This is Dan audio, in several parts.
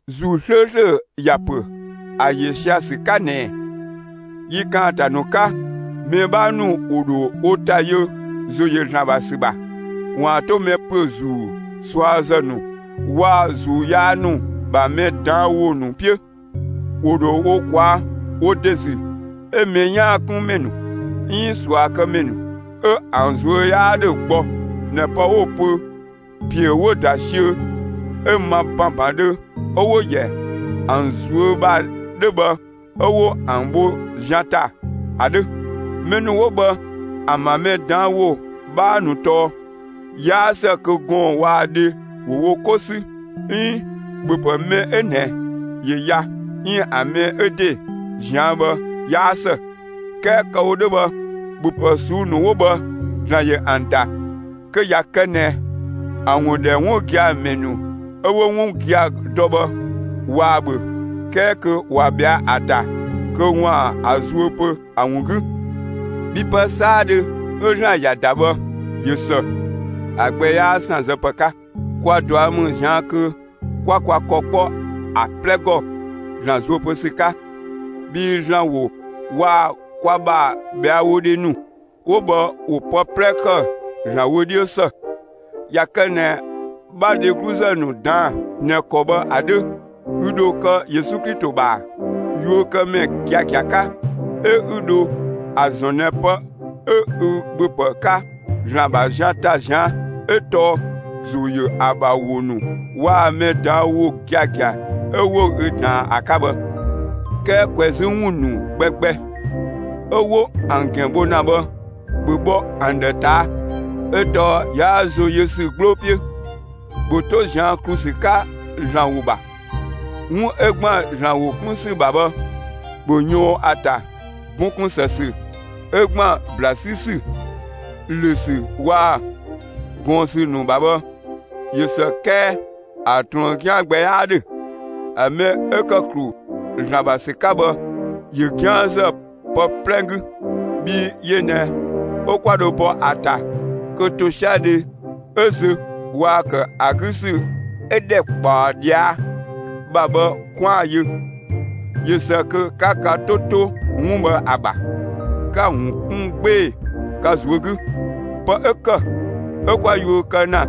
‑Zuu 'slööslö ‑ya ‑pö ‑a ‑yö sia‑ ‑sü 'ka ꞊nɛ: Yi ‑kaanta ‑nu 'ka, mɛ 'bhaa ‑nu ‑wo ‑dho wo ‑ta yö ‑zo ‑yö ‑Zlan ‑bha ‑sü ‑bha, ‑waan 'to mɛ ‑püö ‑zuu ꞊suazë ‑nu waa‑ ‑zuu yaa ‑nu ‑bha mɛ ꞊daan' ‑wo ‑nu 'piö. ‑Wo ‑dho wo ꞊kwaa' wo ‑de ‑zü 'ö mɛ 'yaan‑ 'kun ‑mɛ ‑nu 'iin ꞊suakëmɛ ‑nu 'ö ‑an ꞊zuö' 'yaa 'dhö gbɔ ꞊nɛ pë 'wo‑ pö ‑piö 'wo‑ ‑da siö 'ö ma ‑banbandhö 'ö 'wo‑ ‑yɛ ‑an ꞊zuö' ‑bha 'dhö bhë 'ö 'wo ‑an bho zian ‑ta ‑a 'dhö. Mɛ ‑nu 'wo bhë ‑an ‑bha mɛ ꞊daan' ‑wo 'bhaa ‑nu tɔɔ: 'Yaa ‑së kö gɔɔn‑ waa‑ dhe ‑wo wo 'ko 'sü 'iin ‑bhöpë mɛ 'ö ꞊nɛ ‑yö ya 'iin ‑a mɛ 'ö ‑de ꞊zian' bhë 'yaa ‑së. 'Kɛɛ kë‑ wo 'dhö bhë ‑bhöpë ꞊suu'‑ ‑nu 'wo bhë ‑Zlan ‑yö ‑an ‑da kö ꞊ya kë ꞊nɛ ‑a ‑wun ‑dhɛ 'wun gia‑ ‑mɛ ‑nu 'ö 'wo 'wun gia‑ dɔ bhë ꞊waa‑ ‑bhö 'kɛɛ kö ꞊wa ꞊bhɛa'‑ ‑ta, kö ‑waan ‑a zuö pö ‑a ‑wun 'gü. Bhii pë 'saadhö 'ö ‑Zlan ‑ya ‑da bhë, ꞊yö ‑së; ‑a gbɛ 'yaa ‑sanzë ‑pë 'ka. Kwa ꞊dua' ‑mü ꞊zian' kö 'kwa kwa ‑kɔ 'kpɔ ‑a 'plɛ ‑gɔ ‑Zlan zuö pö ‑sü 'ka. Bhii ‑Zlan ‑wo waa‑ kwa ‑bha ꞊bhɛawodhe ‑nu 'wo bhë ‑wo pë 'plɛ ‑kë ‑Zlan wö 'dhiö ‑së. ꞊Ya kë ꞊nɛ 'bha dhegluzë ‑nu ꞊daan'‑ ꞊nɛ ‑kɔ bhë ‑a 'dhö, ü ‑dho kë Yesu Klito ‑bha yuökëmɛ giagia 'ka, 'ö 'ü dho ‑a ‑zɔn ꞊nɛ pë 'ö ü ‑bhöpë 'ka ‑Zlan ‑bha zian ‑ta ꞊zian' 'ö tɔɔ ‑zo ‑yö ‑a ‑bha ‑wo ‑nu waa‑ mɛ ꞊daan' ‑wo giagia 'ö 'wo ü ꞊daan ‑a 'ka bhë. 'Kɛɛ ꞊kwɛzü ‑wun ‑nu gbɛgbɛ 'ö 'wo ‑an ‑gɛn bho ‑na bhë, ‑bhö bhɔ ‑an ‑dhë ꞊taa' 'ö tɔɔ 'yaa ‑zo yö ‑sü 'gbloo 'piö. ‑Bhö 'to ꞊zian' ‑klu ‑sü 'ka ‑Zlan ‑wo ‑bha. 'Wun 'ö ‑gban ‑Zlan ‑wo 'kun ‑sü ‑bha bhë, ‑bhö ꞊yɔɔn ‑a ‑ta! Bun ‑kun ‑së ‑sü 'ö ‑gban ‑bla 'sü ‑sü, ‑lö ‑sü waa‑ ꞊gɔɔn ‑sü ‑nu ‑bha bhë, ꞊yö ‑së 'kɛɛ ‑a ꞊truën 'gian gbɛ 'yaa 'dhö. ‑A mɛ 'ö ‑kë ‑klu ‑Zlan ‑bha ‑sü 'ka bhë, ꞊yö 'gianzë pë 'plɛ 'gü, bhii yö ꞊nɛ 'ö 'kwa dho bɔ ‑a ‑ta kö ‑tosiadhe 'ö zö waa‑ ‑kë ‑a 'gü ‑sü 'ö ‑dhɛkpaɔ ꞊dhia' ‑bha bhë 'kwaan‑ yö. ꞊Yö ‑së kö 'ka ka 'to 'to 'wun bhë ‑a ‑bha, 'ka‑ ‑wun 'kun 'gbee‑ ka ꞊zuö' 'gü. Pë 'ö ‑kë 'ö 'kwa yuö kë ‑na,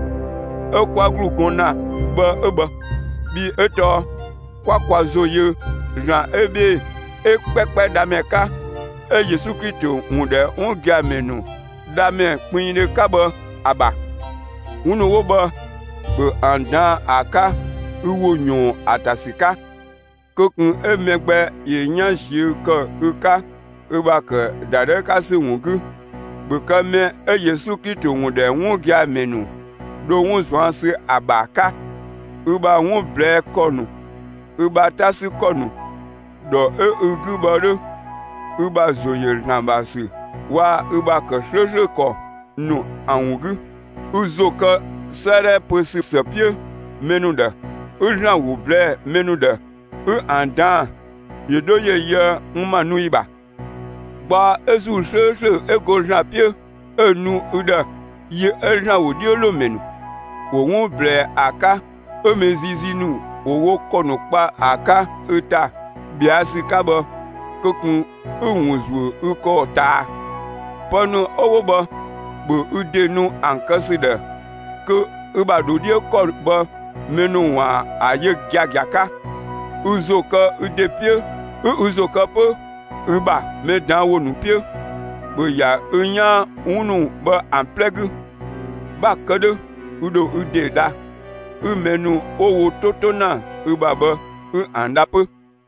'ö 'kwa ‑glu gɔn ‑na bhë 'ö bhë; bhii 'ö tɔɔ 'kwa kwa ‑zo yö ‑Zlan 'ö 'bhee‑ 'ö 'kpɛkpɛ Dhamɛ 'ka, 'ö Yesu Klito ‑wun ‑dhɛ 'wun gia‑ ‑mɛ ‑nu Dhamɛ kpinngdhö 'ka bhë ‑a ‑bha. 'Wun ‑nu 'wo bhë, ‑bhö ‑an ꞊daan'‑ ‑a 'ka ü ‑wo ꞊yɔɔn ‑a ‑ta ‑sü 'ka! Kö ꞊kun 'ö mɛ gbɛ ‑yö 'yan ꞊ziö' ‑kë ü 'ka, ü ‑bha ‑kë ‑dadhëü 'ka ‑sü ‑wun 'gü! ‑Bhö kë mɛ 'ö Yesu Klito ‑wun ‑dhɛ 'wun gia‑ ‑mɛ ‑nu dho 'wun ꞊zuan' ‑sü ‑a ‑bha 'ka, ü ‑bha 'wun ꞊blɛɛ'‑ ‑kɔ ‑nu, ü ‑bha 'ta 'sü ‑kɔ ‑nu, ‑dhɔ 'ö ü 'gü bhë 'dhö, ü ‑bha ‑zo ‑yö ‑Zlan ‑bha ‑sü waa‑ ü ‑bha ‑kë 'slööslö ‑kɔ ‑nu ‑an ‑wun 'gü. Ü ‑zo kë 'sëëdhɛ pö ‑sü ‑së 'piö mɛ ‑nu ‑dhë, 'ü ‑Zlan ‑wo ꞊blɛɛ'‑ mɛ ‑nu ‑dhë; 'ü ‑an ꞊daan'‑ ‑yö 'dho ‑yö yöë n ‑ma nu ‑yi ‑bha. Gbaɔ 'ö ‑Zuu 'slööslö 'ö go ‑Zlan 'piö 'ö‑ nu ü ‑dhë yi 'ö ‑Zlan ‑wodhiölomɛ ‑nu ‑wo 'wun ꞊blɛɛ ‑a 'ka 'ö mɛ ziizii ‑nu ‑wo wo ‑kɔ ‑nu kpa ‑a 'ka ü ‑ta ꞊bhɛa' ‑sü 'ka bhë, kö ꞊kun 'ü‑ ‑wun zuö ü ‑kɔ ꞊taa. Pë ‑nu 'ö 'wo bhë, ‑bhö ü ‑de nu ‑an kë ‑sü ‑dhë kö ü ‑bha ‑dho 'dhiö ‑kɔ bhë mɛ ‑nu ‑waan ‑a yö giagia 'ka. Ü ‑zo kë ü ‑de 'piö 'ü ü ‑zo kë 'pö ü ‑bha mɛ ꞊daan' ‑wo ‑nu 'piö! ‑Bhö ‑ya ü 'yaan 'wun ‑nu bhë ‑an 'plɛ 'gü! 'Bha‑ kë 'dhö, ü ‑dho ü ‑de dha, 'ü mɛ ‑nu 'wo wo 'to 'to ‑na ü ‑bha bhë, 'ü ‑an dha 'pö.